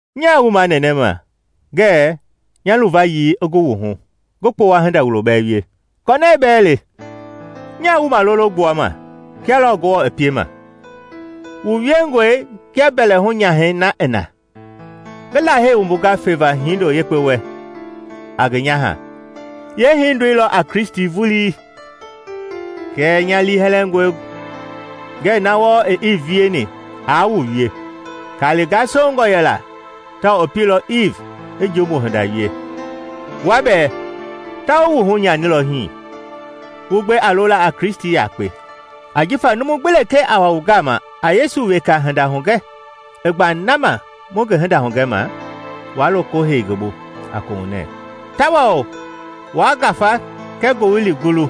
Nyaa wu manɛnɛma ngɛɛ nya luvayii i gu wu hu, ngi kpowa hinda wulo bɛɛ wie. Kɔnɛɛ bɛɛ le! Nyaa wu malolo gbuama kia lɔɔ Ngewɔ i piema; wu wiengɔe kia mbɛlɛhu-nyahɛi na i na, ngi Lahei wumbunga feva hindo yekpe wɛ a ngi nyaha, yeehindoi lɔ a Kristi vulii. Kɛɛ nya liihɛlɛngɔe ngɛɛ na wɔɔ i Iiv wieni aa wu wie. Kali gasongɔ yɛla tawao i pielɔ Iiv i jumbu hinda wie. Wua bɛɛ ta wu wuhu nyanilɔ hii, wu gbe a lola a Kristi yakpe. Ajifa numu gbi lekee a wa wu gama a Yesu weka hinda hugɛ i gba na ma mu ngi hinda hugɛma, wa loko heilɔ ngi bu a kohunɛ; tawao wa ngafa kɛɛ ngowili gululɔ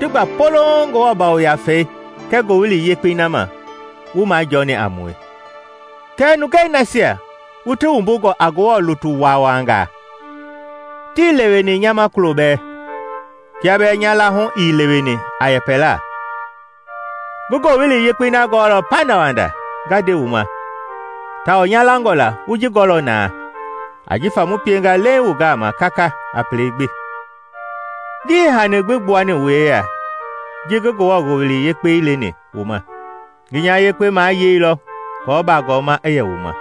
ti gba polouŋ Ngewɔ Yafei kɛɛ Ngowili Yekpei na ma, wu majɔɔni a mue! Kɛɛ nungei nasia wu ti wumbungɔ a Ngewɔ lutu waawangaa tii leweni nya ma kulo bɛɛ. Kia bɛɛ nya laahu ii leweni a yɛpɛla, ngi Wowili Yekpei na gɔɔlɔ pandawanda nga nde wu ma tawao nya langɔ la wu ji gɔɔlɔ na ajifa mu pienga leiŋ wu gama kaka a pelei gbi. Ngii hani gbi gbuani wu yeya ji ngi Ngewɔ Ngowili Yekpei leni wu ma; ngi nya yekpe mayeilɔ kɔɔ baagɔma i yɛ wu ma.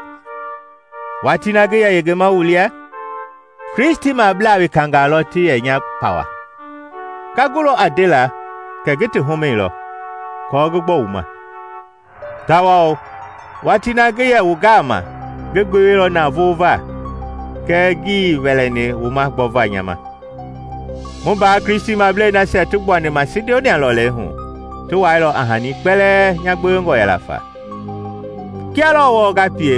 Watii na ngi yɛ yengema wu lia Kristimablaa wekangaa lɔ ti yɛ nya pawa. Nga gulɔ a ndela kɛ ngi ti humɛilɔ aako ngi gbɔ wu ma. Tawao watii na ngi yɛ wu gama ngi gbeweilɔ navoo va kɛɛ ngii wɛlɛni wu ma gbɔva nya ma; mu mbaa Kristimablei nasia ti gbuani Masidonia lɔlei hu ti wailɔ a hani kpɛlɛɛ nya gbewengɔ yɛla fa. Kia lɔɔ wɔɔ nga pie,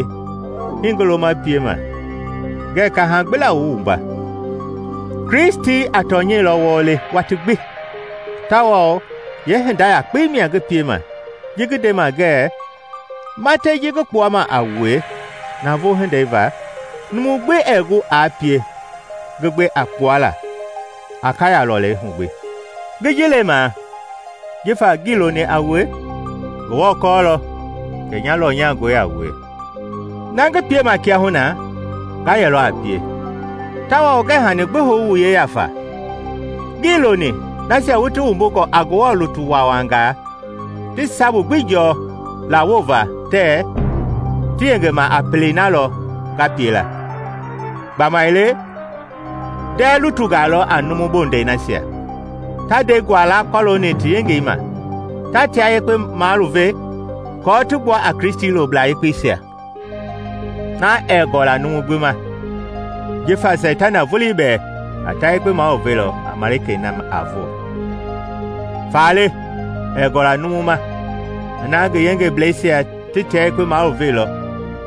hii ngi loma piema; ngɛɛ kaha gbi la wu wumba. Kristi a tɔnyɛi lɔ wɔɔ le watii gbi tawao yeehinda yakpei mia ngi piema ji ngi ndema ngɛɛ matɛi ji ngi kpuama a wue navoo hindei va, numu gbi ɛɛ gu aa pie ngi gbe a kpuala Akaya lɔlei hu gbi. Ngi ji lemaa jifa ngii loni a wue? Ngewɔ kɔɔlɔ kɛ nya lɔnyangɔe a wue. Na ngi piema kiahuna nga yɛlɔ a pie, tawao ngɛɛ hani gbi hou wu yeya fa, ngii loni nasia wu ti wumbungɔ a Ngewɔ lutu waawangaa ti sabu gbi jɔɔ lawova tɛɛ ti yengema a pelei na lɔ nga pie la. Gbamaile ndɛɛ lutungaa lɔ a numu bondɛi nasia, ta ndɛi guala kɔlooni ti yengei ma, ta tia yekpe maluve aako ti gbua a Kristi loblaa yekpeisia. Na ɛɛ gɔla numu gbi ma! Jifa Seitana vulii bɛɛ a ta yekpe maluvelɔ a malikei na a voo. Faale ɛɛ gɔla numu ma ina ngi yengebleisia ti tia yekpe maluveilɔ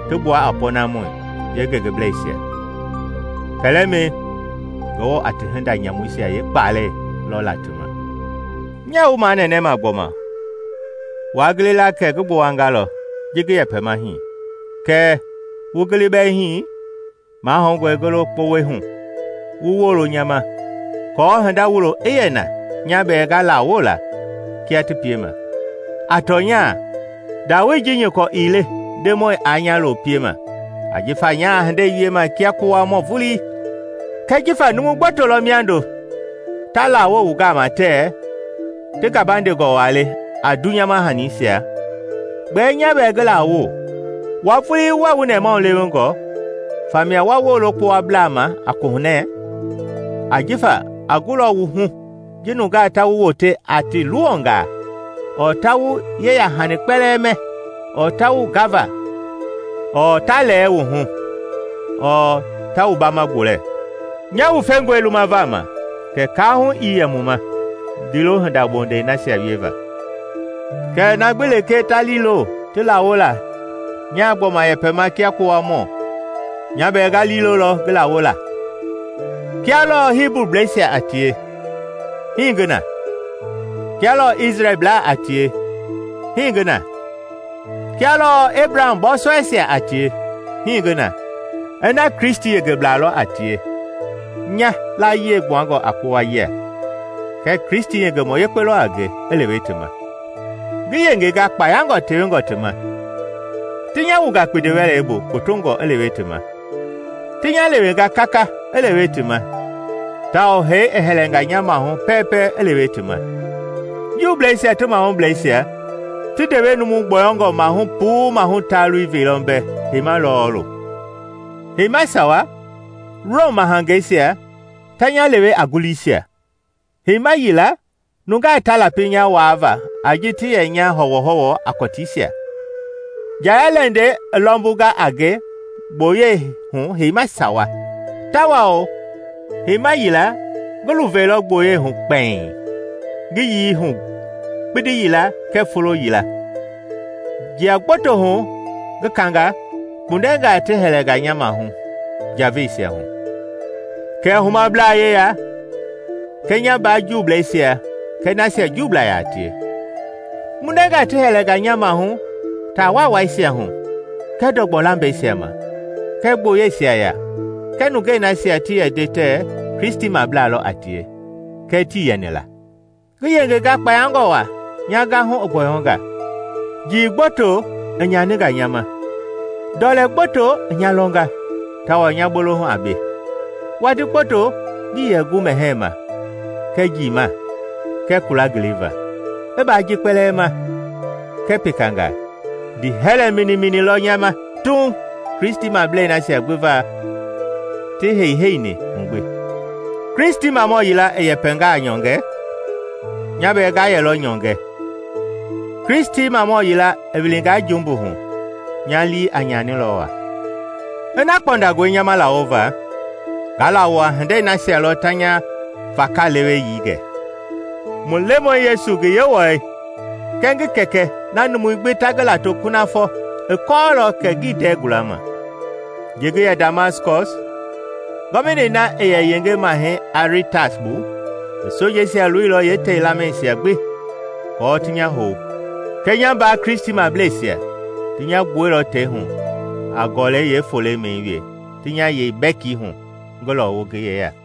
ti gbua a pɔɔnamɔi yengebleisia. Kɛlɛmɛi, Ngewɔ a ti hinda nyamuisia yeekpalɛi lɔ la ti ma. Nyaa wu manɛnɛma gbɔma: waa gili la kɛ ngi gbowangalɔ ji ngi yɛpɛma hii. Kɛɛ wu gili bɛɛ hii, mahoungɔe ngi lo kpowɛi hu wu woolo nya ma aako hinda wulo i yɛ na nya bɛɛ nga lawo la kia ti piema. A tɔnya ndawoei ji nyɔkɔ ii le Ndemɔi aa nya lo piema ajifa nyaa hindei wiema kia kpowamɔ vulii. Kɛɛ jifa numu gboto lɔ miando ta lawo wu gama tɛɛ ti gabandengɔ waa le a dunyama hanisia, gbɛɛ nya bɛɛ ngi laawo: wua vulii wuɛɛ wu nɛmahulewengɔ, famia wa woolo kpowablaa ma a kohunɛ! Ajifa a gulɔ wu hu ji nungaa ta wu wote a ti luwɔngaa ɔɔ ta wu yeyahani kpɛlɛɛ mɛ ɔɔ ta wu gava ɔɔ ta lɛɛ wu hu ɔɔ ta wu baama gbolɛ. Nya wufengɔe lumava ma kɛ kaahu ii yɛ mu ma kɛɛ ndiilo hinda bondɛi nasia wieva! Kɛɛ na gbi lekee ta liilo ti lawo la nyaa gbɔma yɛpɛma kia kpowamɔ nya bɛɛ nga liilolɔ ngi laawo la. Kia lɔɔ Hibublɛisia a tie, hii ngi na. Kia lɔɔ Isrɛlblaa a tie, hii ngi na. Kia lɔɔ Ebraham bɔɔsɔɛisia a tie, hii ngi na. Ina Kristi yengeblaa lɔ a tie nya layie gbuangɔe a kpowa yia kɛ Kristi yengemɔ yekpe lɔ a nge i lewe ti ma! Ngi yengenga kpayangɔ tewengɔ ti ma, ti nya wunga kpindi-wɛlei bu kpotongɔ i lewe ti ma, ti nya lewenga kaka i lewe ti ma tawao hee i hɛlɛnga nya maahu pɛɛpɛ i lewe ti ma. Juubleisia ti mahublɛisia ti ndewe numu gbɔyɔngɔ maahu puu maahu taalui veilɔ mbɛ heima lɔɔlu. Heima sawa Rom mahangeisia ta nya lewe a nguliisia; heima yila nungaa ta lapi nya waava a ji ti yɛ nya hɔwɔhɔwɔ a kɔtiisia. Njaya-lɛndɛi i lɔmbunga a nge gboyei hu heima sawa, tawao heima yila ngi luveilɔ gboyei hu kpɛiŋ, ngi yii hu kpindi yila kɛɛ folo yila. Jia kpoto hu ngi kanga, kpundɛngaa ti hɛlɛnga nya maahu njaveisia hu, kɛɛ humablaa yeya, kɛɛ nya mbaa Juubleisia kɛɛ nasia Juublaa yaa tie. Kpundɛngaa ti hɛlɛnga nya maahu taa waawaisia hu kɛɛ ndɔgbɔ lambɛisia ma kɛɛ gboyeisia ya kɛɛ nungei nasia ti yɛ nde tɛɛ Kristimablaa lɔ a tie kɛɛ tii yɛni la. Ngi yengenga kpayangɔ waa nya gahu i gbɔyɔnga; njii gboto i nyaninga nya ma; ndɔlɛ gboto i nya lɔnga tawao nya bolohu a be; watii gboto ngii yɛ gu mɛhɛɛ ma kɛɛ njiima kɛɛ kula ngiliva. I baa ji kpɛlɛɛ ma kɛɛ pekangaa, ndiihɛlɛ minimini lɔ nya ma Tuuŋ Kristimablei nasia gbi va ti heiheini hu gbi. Kristimamɔ yila i yɛngaa nyɔngɛ, nya bɛɛ nga yɛlɔ nyɔngɛ; Kristimamɔ yila i wilingaa jumbu hu, nya lii a nyanilɔ waa. Ina kpɔndangɔe nya ma lawova, nga laawo a hindei nasia lɔ ta nya vakaleweyii gɛ. Mu Lemɔi Yesu ngi Yewɔɛi kɛɛ ngi Kɛkɛ na numui gbi ta ngi lato kunafɔ i kɔɔlɔ kɛ ngii ndɛɛ gulama. Ji ngi yɛ Damaskɔs, gɔvinei na i yɛ yenge Mahɛi Aritas bu i sojeisia loilɔ yee tei lamɛisia gbi aako ti nya hou. Kɛɛ nya mbaa Kristimableisia ti nya gbuɛilɔ tei hu a gɔlɛi yeefolemɛi wee ti nya yei bɛki hu ngi lɔwu ngi yeya.